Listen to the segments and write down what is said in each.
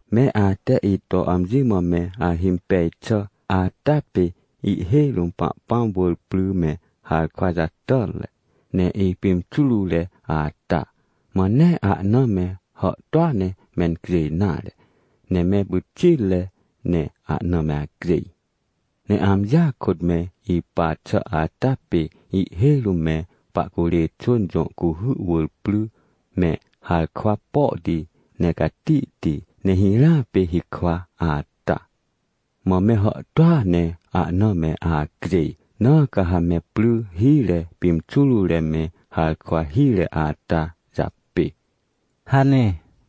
— Me ate ito amji mã me ahimpej xà ata pê ihhêj rũm Pahpãm wỳr pry me harkwa hire, ne ipimxurure ata. Mã nee ahna me hàhtôa ne mencjêj nare, ne me pyxitre ne ahna me acjêj. Ne amjia kôt me ipa xà ata pê ihhêj rũm me pahcurê xwỳn jõ cuhy wỳr pry, me harkwa pohti ne catihti ne hirãa pê hikwa ata. Mã me hàhtôa ne ahna me acjêj. Na ca ha me pry hire pimxurure me harkwa hire ata japê — hane.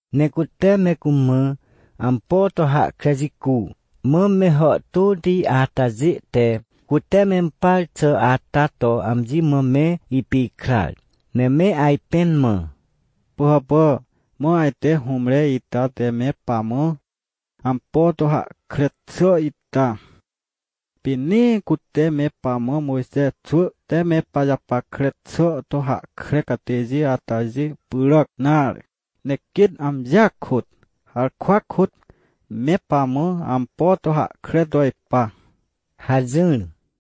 Ne cute me cumã ampo to hahkre jicu, mã me hàhtôti atajê te, cute mempar xà ata to amji mã me ipikrar, ne me ajpẽn mã: — Pỳhàpà, mã ajte hũmre ita te me pamã ampo to hahkre xà ita, pê nee cute me pamã Mojxe xwỳ te me pajapackre xà to hahkre catêjê atajê pyràc nare, ne quêt amjia kôt, harkwa kôt, me pamã ampo to hahkre to ipa — hajỹr.